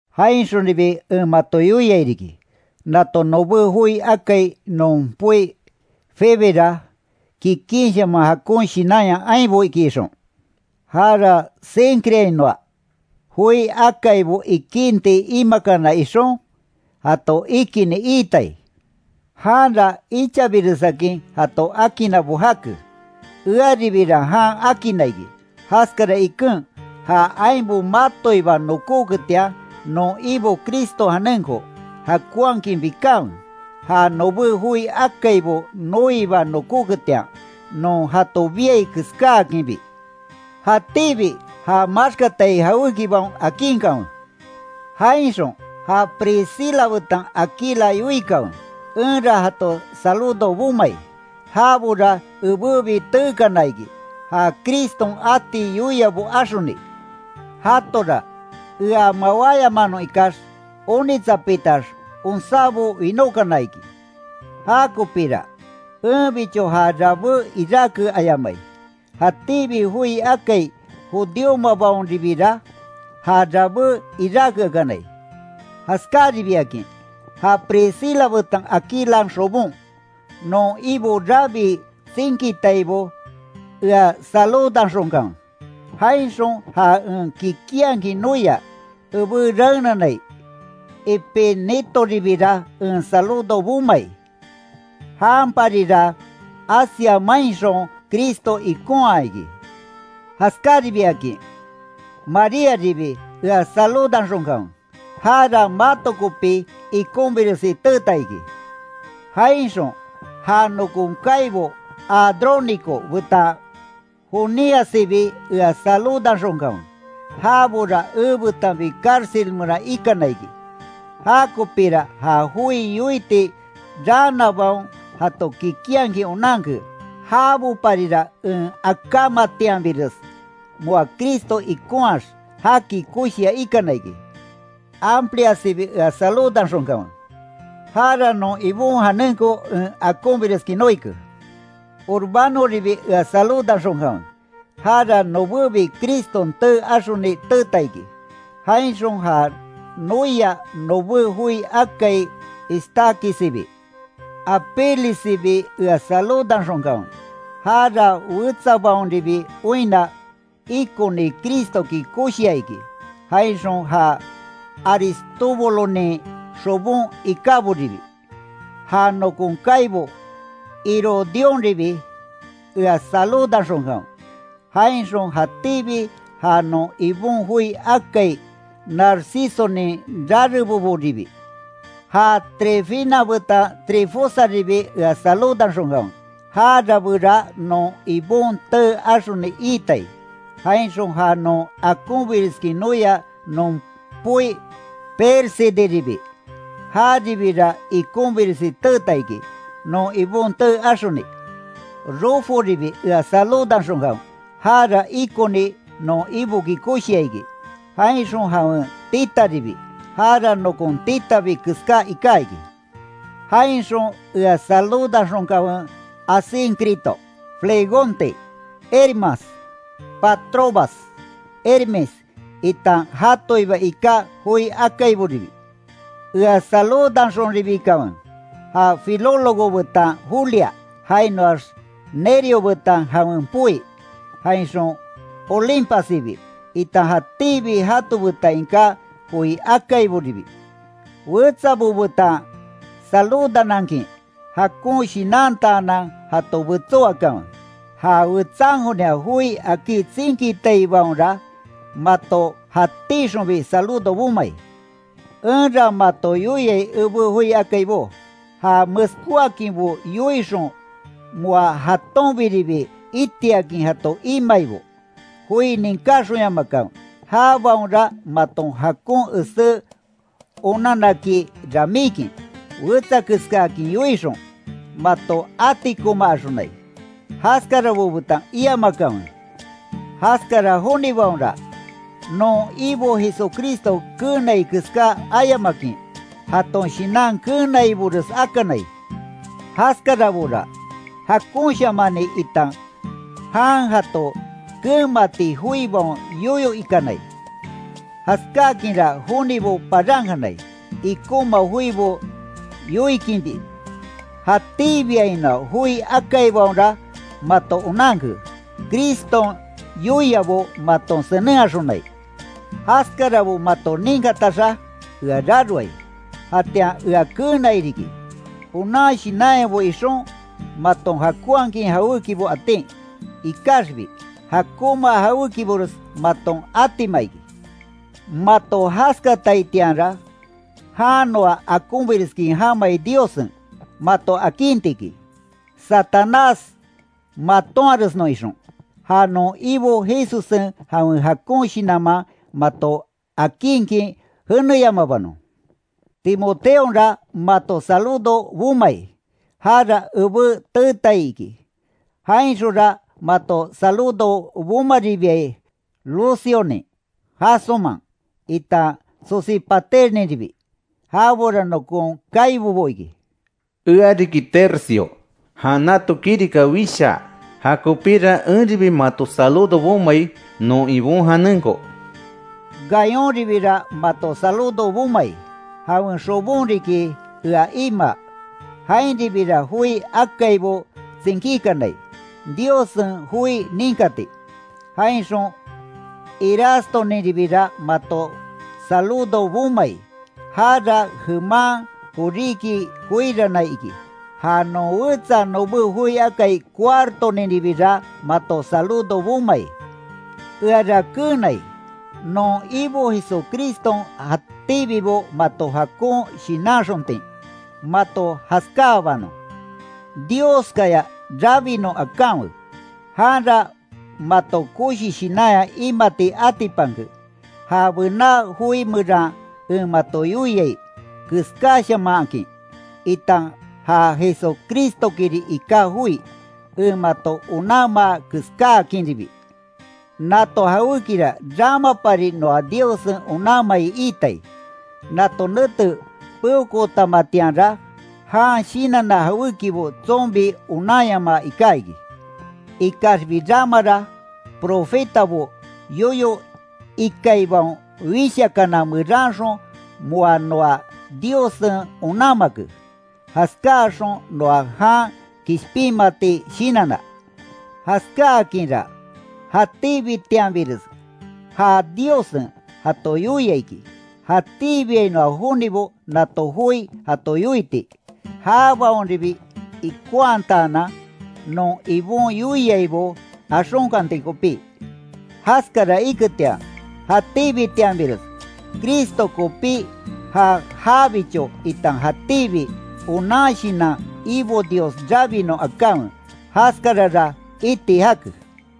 Jainxonribi en mato yoiai riki, nato nobé joi akai non poi Febera kikinshaman jakon shinanya ainbo iki ixon, jara Cencreainoa joi akaibo ikinti imakana ixon, jato ikinni iitai. Janra ichabiresakin jato akinnabo jake, earibira jan akinna iki, jaskara iken, ja ainbo matoiba nokóketian, non Ibo Criston janenko, jakonhakin bikanwe, ja nobé joi akaibo noiba nokóketian, non jato biai keskáakinbi. Jatíbi ja maxkatai jawékibaon akinkanwe. Jainxon ja Priscila betan Aquila yoikanwe, enra jato saludo bomai, jabora ebébi teekana iki, ja Criston ati yoiabo axoni. Jatora, ea mawáyamanon ikax, onitsapitax onsábo winókana iki. Jakopíra, enbicho ja rabé iráke ayamai, jatíbi joi akai judíomabaonribira, ja rabé iráke akanai. Jaskaribiakin, ja Priscila betan Aquilan xobon, non Ibo rabii tsinkitaibo ea saludanxonkanwe. Jainxon ja en kikinhakin noia, ebé raenanai Epenetoribira en saludo bomai, janparira, Asia mainxon Cristo ikonhaa iki. Jaskaribiakin, Maríaribi ea saludanxonkanwe, jara mato kopi ikonbiresi teeta iki. Jainxon ja nokon kaibo Andrónico betan Juniassibi ea saludanxonkanwe. Jabora ebetanbi cárcel meran ikana iki. Jakopira ja joi yoiti raanabaon jato kikinhakin onanke. Jaboparira en akamatianbires, moa Cristo ikonhaax, jaki koshia ikana iki. Ampliassibi ea saludanxonkanwe, jara non Ibon janenko en akonbireskin noike. Urbanoribi ea saludanxonkanwe, jara nobébi Criston tee axoni teeta iki. Jainxon ja noia nobé joi akai Estaquissibi. Apelessibi ea saludanxonkanwe, jara wetsabaonribi oinna, ikoni Cristoki koshia iki. Jainxon ja Aristóbulonin xobon ikáboribi. Ja nokon kaibo Herodiónribi ea saludanxonkanwe, jainxon jatíbi ja non Ibon joi akai Narcisonin rareboboribi. Ja Trifena betan Trifosaribi ea saludanxonkanwe, ja rabéra non Ibon tee axoni iitai. Jainxon ja non akonbireskin noia non poi Pérsideribi, jaribira ikonbiresi teeta iki, non Ibon tee axoni. Ruforibi ea saludanxonkanwe, jara ikoni non Iboki koshia iki. Jainxon jawen titaribi, jara nokon titabi keská iká iki. Jainxon ea saludanxonkanwe, Asíncrito, Flegonte, Hermas, Patrobas, Hermes itan jatoiba iká joi akaiboribi. Ea saludanxonribikanwe, ja Filólogo betan Julia, jainoax Nereo betan jawen poi, jainxon Olimpassibi itan jatíbi jato betan iká joi akaiboribi. Wetsabo betan saludanankin, jakon shinantaanan jato betsó akanwe. Ja wetsankonia joi akí tsinkitaibaonra, mato jatíxonbi saludo bomai. Enra mato yoiai ebé joi akaibó, ja meskóakinbo yoixon moa jatonbiribi itiakin jato imaibo, joi ninkáxonyamakanwe, jabaonra maton jakon esé onanaki ramíkin, wetsakeskaakin yoixon, mato atikomaaxonai. Jaskarabo betan iamakanwe. Jaskara jonibaonra, non Ibo Jesucristo keenai keská ayamakin, jaton shinan keenaibores akanai. Jaskarabora, jakonshamani itan jan jato keenmati joibaon yoyo ikanai. Jaskakinra jonibo parankanai, ikonma joibo yoikinbi. Jatíbiainoa joi akaibaonra mato onanke, Criston yoiabo maton senenhaxonai. Jaskarabo mato ninkataxa, ea raroai. Jatian ea keenai riki, onan shinanyabo ixon, maton jakonhakin jawékibo atin. Ikaxbi, jakonma jawékibores maton atima iki. Mato jaskataitianra, jan noa jakonbires jamai Diossen, mato akinti iki, Satanás matonharesnon ixon. Ja non Ibo Jesussen jawen jakon shinanman mato akinkin jeneyamabanon. Timoteonra mato saludo bomai, jara ebé teetai iki. Jainxonra mato saludo bomaribiai, Lucionin, Jasónman, itan Sosípaterninribi, jabora nokon kaibobo iki. Eariki Tercio, jan nato kirika wishaa, jakopira enribi mato saludo bomai, non Ibon janenko. Gayonribira mato saludo bomai. Jawen xobon riki ea imaa. Jainribira joi akaibo tsinkíkanai, Diossen joi ninkati. Jainxon Erastoninribira mato saludo bomai. Jara jeman koríki koirannai iki. Ja non wetsa nobé joi akai Cuartoninribira mato saludo bomai. Eara keenai, non Ibo Jesucriston jatíbibo mato jakon shinanxontin, mato jaskáabanon. Dioskaya rabinon akanwe, janra mato koshi shinanya imati atipanke, ja bená joi meran en mato yoiai keskáshamanhakin, itan ja Jesucristokiri iká joi, en mato onanmaa keskáakinribi. Nato jawékira ramapari noa Diossen onanmai itai, nato nete peokootamatianra jan shinanna jawékibo tsonbi onanyamaa iká iki. Ikaxbi ramara, profetabo yoyo ikaibaon wishakana meranxon moa noa Diossen onanmake, jaskáaxon noa jan kishpinmati shinanna. Jaskáakinra jatíbitianbires já Diossen jato yoia iki, jatíbiainoa jonibo nato joi jato yoiti. Jabaonribi ikonhataanan, non Ibon yoiaibo axonkanti kopí. Jaskara iketian, jatíbitianbires Cristo kopí ja jabicho itan jatíbi onan shinan Ibo Dios rabinon akanwe. Jaskarara iti jake.